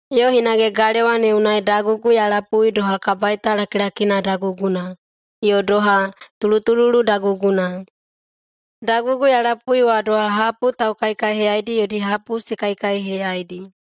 Yo hinage galewa ne unai dagugu ya lapui doha kabaita lakilakina daguguna yo doha tulutululu daguguna. Dagugu ya lapui wa doha hapu taukaikaiheyaidi yodi hapu se kaikaiheyaidi.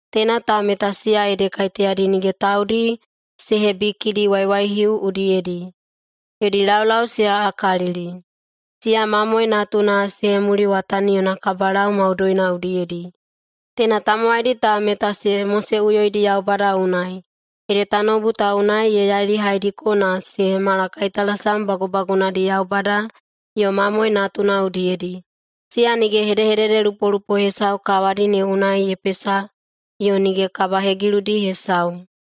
Teina ta meta siya ede kaiteyadi nige taudi se hebikidi waiwaihiuwo udiyedi. Yodi laulau se aꞌakalili. Siya Mamoe Natuna se hemuliwatani yona kabalau maudoina udiyedi. Teina tamowaidi ta meta se moseꞌuyoidi Yaubada unai, ede tanoubu ta unai ye yailihaidiko na se hemala kaitalasam bagubagunadi Yaubada yo Mamoe Natuna udiyedi. Siya nige hedehededelupolupo hesau kawadi ne unai ye pesa yo nige kabahegiludi hesau.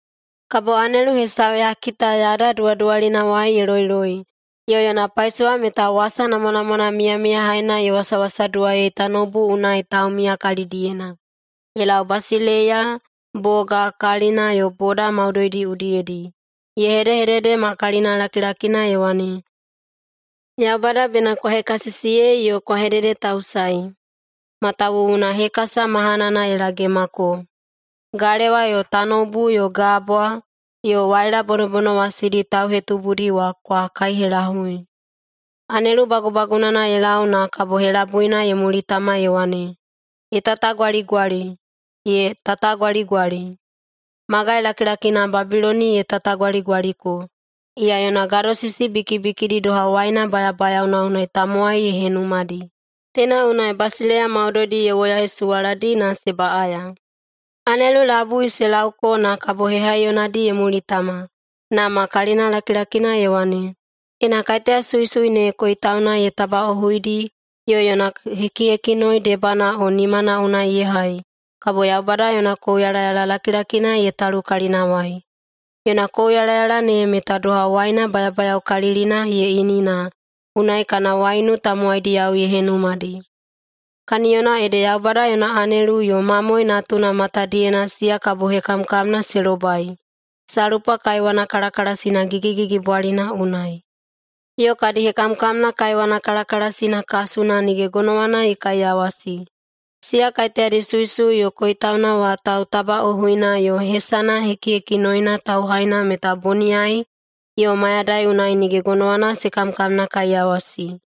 Kabo anelu hesau ya kita yada duwaduwalinawai ye loiloi, yo yona paisowa meta wasa namwanamwana miyamiyahaina ye wasawasaduwaiyei tanoubu unai taumiya kalidiyena, ye lau basileiya, boga, kalina, yo boda maudoidi udiyedi. Ye hedehedede ma kalinalakilakina ye wane, “Yaubada bena kwa hekasisiyei yo kwa hededetausaei, matawuwuna hekasa mahanana ye lagemako. Galewa yo tanoubu yo gabwa yo waila bonobonowasidi tauhetubudi wa kwa kaihelahui.” Anelu bagubagunana ye lau na kabo helabuina ye mulitama ye wane, “Ye tatagwaligwali, ye tatagwaligwali! Magai lakilakina Babiloni ye tatagwaligwaliko. Iya yona gadosisi bikibikidi doha waina bayabayaona unai tamowai ye henumadi. Teina unai basileiya maudoidi ye woyahesuwaladi na se baꞌaya.” Anelu labui wa se lauko na kabo hehaiyonadi ye mulitama, na ma kalinalakilakina ye wane, “Ena kaiteya suisui ne yo koitauna ye tabaꞌohuidi yo yona hekihekinoi debana o nimana unai ye hai, kabo Yaubada yona kouyalayala lakilakina ye talu kalinawai. Yona kouyalayala ne meta doha waina bayabayaokalilina ye ini na unai kana waiunu tamowaidiyao ye henumadi. Kaniyona ede Yaubada yona anelu yo Mamoe Natuna matadiyena siya kabo hekamkamna se lobai salpa kaiwana kalakalasina gigigigibwalina unai. Yo kadi hekamkamna kaiwana kalakalasina kasuna nige gonowana ye kaiyawasi. Siya kaiteyadi suisui yo koitauna wa tautabaꞌohuina yo hesana hekihekinoina tauhaina meta boniyai yo mayadai unai nige gonowana se kamkamnakaiyawasi.”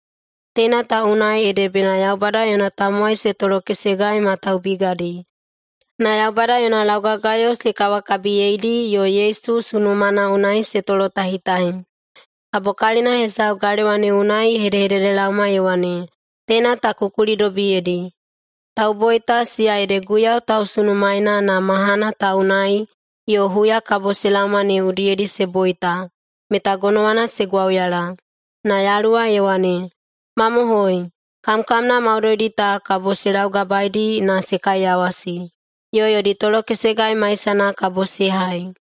Teina ta unai ede bena Yaubada yona tamowai se tolokesegai ma taubigadi, na Yaubada yona laugagayo se kawakabiyeidi yo Yesu sunumana unai se tolotahitahi. Kabo kalina hesau galewa ne unai ye hedehededelaoma ye wane, “Teina ta ku kulidobiyedi: Tauboita, siya ede Guiyau tausunusunumaena na mahana ta unai yo huya kabo se laoma ne udiyedi se boita, meta gonowana se gwauyala.” Na Yaluwa ye wane, “Mamohoi, kamkamna maudoidi ta kabo se laugabaedi na se kaiyawasi, yo yodi tolokesegai maisana kabo se hai.”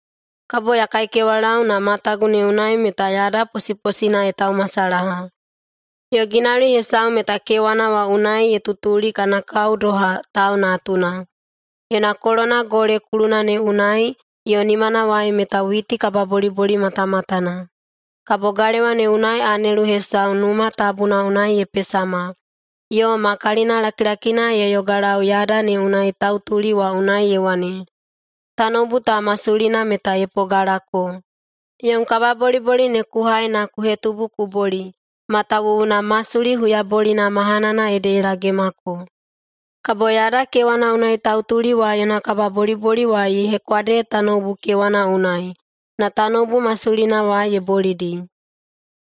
Kabo ya kaikewalau, na matagu ne unai meta yada posiposina ye taumasalaha, yo ginauli hesau meta kewana wa unai ye tutuli kana kao doha tau natuna. Yona kolona gole kuluna ne unai yo nimanawai meta witi kababoliboli matamatana. Kabo galewa ne unai anelu hesau Numa Tabuna unai ye pesama, yo ma kalinalakilakina ye yogalau yada ne unai tautuli wa unai ye wane, “Tanoubu ta masulina meta ye pogalako. Yom kababoliboli ne ku hai na ku hetubu ku boli, matawuwuna masuli huyabolina mahanana ede ye lagemako.” Kabo yada kewana unai tautuli wa yona kababoliboli wa ye hekwade tanoubu kewana unai, na tanoubu masulina wa ye bolidi.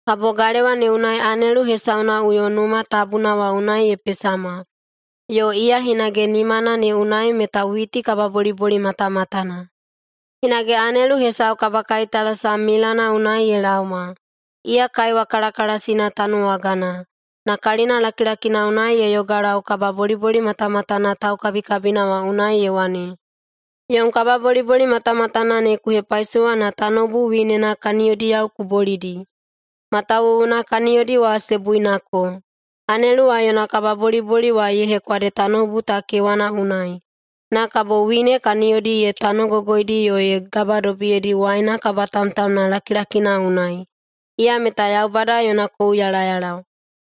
Kabo galewa ne unai anelu hesaunaꞌuyo Numa Tabuna wa unai ye pesama, yo iya hinage nimana ne unai meta witi kababoliboli matamatana. Hinage anelu hesau kabakaitalasam milana unai ye laoma, iya kaiwa kalakalasina tanuwagana, na kalina lakilakina unai ye yogalau kababoliboli matamatana taukabikabina wa unai ye wane, “Yom kababoliboli matamatana ne ku hepaisowa na tanoubu winena kaniyodiyao ku bolidi, matawuwuna kaniyodi wa se buinako.” Anelu wa yona kababoliboli wa ye hekwade tanoubu ta kewana unai, na kabo wine kaniyodi ye tanogogoidi yo ye gabadobiyedi waina kabatamtamna lakilakina unai, iya meta Yaubada yona kouyalayala.